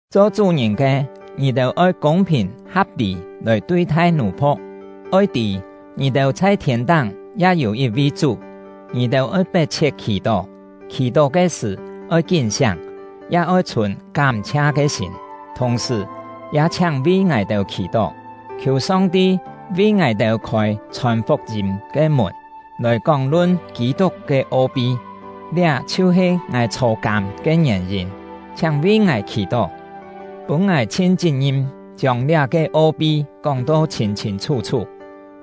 Cho chú-ngìn ke, ngì-têu oi kûng-phìn ha̍p-lî lòi tui-thai nù-phu̍k; oi tî, ngì-têu chhai thiên-táng ya yû yit-vi Chú. Ngì-têu oi pet-chhiet khì-tó, khì-tó ke sṳ̀ oi kín-siáng, ya oi chhùn kám-chhia ke sîm. Thùng-sṳ̀, ya chhiáng vi ngài-têu khì-tó, khiù Song-ti vi ngài-têu khôi chhòn fuk-yîm ke mùn, lòi kóng-lun Kî-tuk ke o-pi. Liá chhiu-he ngài chhô-kâm ke ngièn-yîn. Chhiáng vi ngài khì-tó, pûn ngài chhin chit-ngim chiông liá-ke o-pi kóng-to chhîn-chhîn chhú-chhú.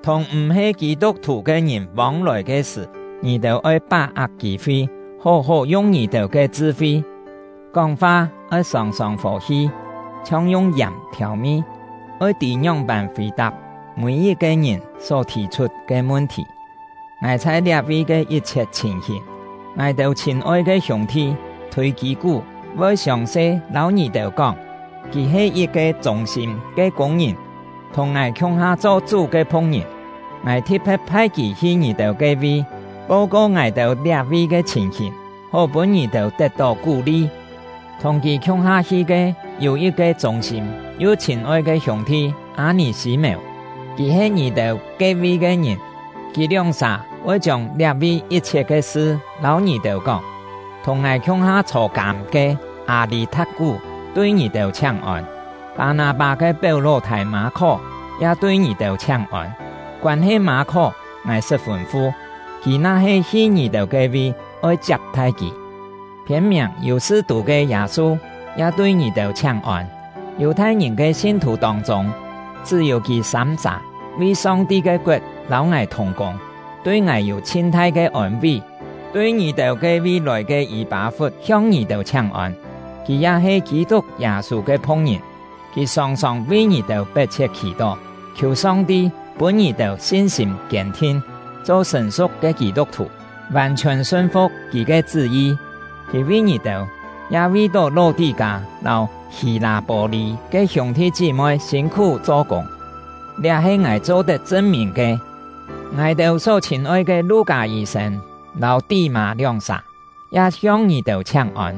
Thùng m̀-he Kî-tuk-thù ke ngìn vông-lòi ke sṳ̀, ngì-têu oi pá-ak kî-fi, hó-hó yung ngì-têu ke chṳ-fi. Kóng-fa oi sòng-sòng fò-hi, chhiong yung yàm thiàu-mi, oi tî ngióng-pân fì-tap mî-yit-ke ngìn só thì-chhut ke mun-thì. Ngài chhai liá-vi ke yit-chhiet chhìn-hìn, ngài-têu chhîn-oi ke hiûng-thi Thûi-kî-kú voi siòng-se lâu ngì-têu kóng. Kì he yit-ke chûng-sîm ke kûng-ngìn, thùng ngài khiung-ha cho Chú ke phu̍k-ngìn. Ngài thi̍t-phe̍t phai kì hi ngì-têu ke-vi, po-ko ngài-têu liá-vi ke chhìn-hìn, hó pûn ngì-têu tet-tó kú-li. Thùng kì khiung-ha hi ke yû yit-ke chûng-sîm yu chhîn-oi ke hiûng-thi Â-nì-sî-mèu; kì he ngì-têu ke-vi ke ngìn. Kì lióng-sà voi chiông liá-vi yit-chhiet ke sṳ lâu ngì-têu kóng. Thùng ngài khiung-ha chhô-kâm ke Â-lî-tha̍t-kú tui ngì-têu chhiáng-ôn. Pâ-nâ-pâ ke péu-ló-thâi Mâ-khó ya tui ngì-têu chhiáng-ôn. (Koân-he Mâ-khó, ngài sṳt fûn-fu, kì na-he hi ngì-têu ke-vi, oi chiap-thai kì.) Phiên-miàng Yù-sṳ-tû ke Yâ-su ya tui ngì-têu chhiáng-ôn. Yù-thai-ngìn ke sin-thù tông-chûng, chṳ́-yû kì sâm-sà vi Song-ti ke koet lâu ngài thùng-kûng, tui ngài yû chhin-thai ke ôn-ví. Tui ngì-têu ke-vi lòi ke Yî-pâ-fut hiong ngì-têu chhiáng-ôn; kì ya he Kî-tuk Yâ-sû ke phu̍k-ngìn. Kì sòng-sòng vi ngì-têu pet-chhiet khì-tó, khiù Song-ti pûn ngì-têu sin-sîm kiên-thin, cho sṳ̀n-su̍k ke Kî-tuk-thù, vàn-chhiòn sun-fu̍k Kì ke chṳ́-yi. Kì vi ngì-têu, ya vi-tó Ló-tí-kâ lâu Hî-lâ-pô-lî ke hiûng-thi chí-moi sîn-khú cho-kûng; liá he ngài cho-tet chṳn-mìn ke. Ngài-têu só chhîn-oi ke Lu-kâ yî-sên lâu Tí-mâ lióng-sà ya hiong ngì-têu chhiáng-ôn.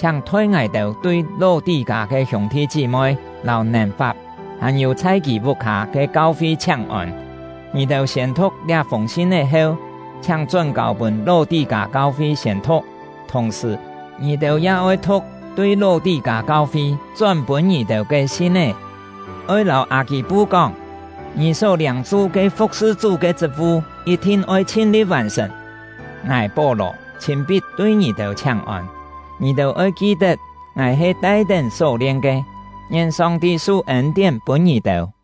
Chhiáng thoi ngài-têu tui Ló-tí-kâ ke hiûng-thi chí-moi, lâu Nèn-fap, hàn-yû chhai kì vuk-hâ ke kau-fi chhiáng-ôn. Ngì-têu siên-thu̍k liá-fûng sin-é heu, chhiáng chón-kâu pûn Ló-tí-kâ kau-fi siên-thu̍k; thùng-sṳ̀, ngì-têu ya oi thu̍k tui Ló-tí-kâ kau-fi chón pûn ngì-têu ke sin-é. Oi lâu Â-kî-pu kóng: “Ngì só liâng-su ke fu̍k-sṳ Chú ke chṳt-vu yit-thin oi chhin-li̍t vàn-sṳ̀n.” Ngài — Pó-lò chhîn-pit tui ngì-têu chhiáng-ôn. Ngì-têu oi ki-tet ngài he tai-tén só-lien ke! Ngien Song-ti su ên-tién pûn ngì-têu!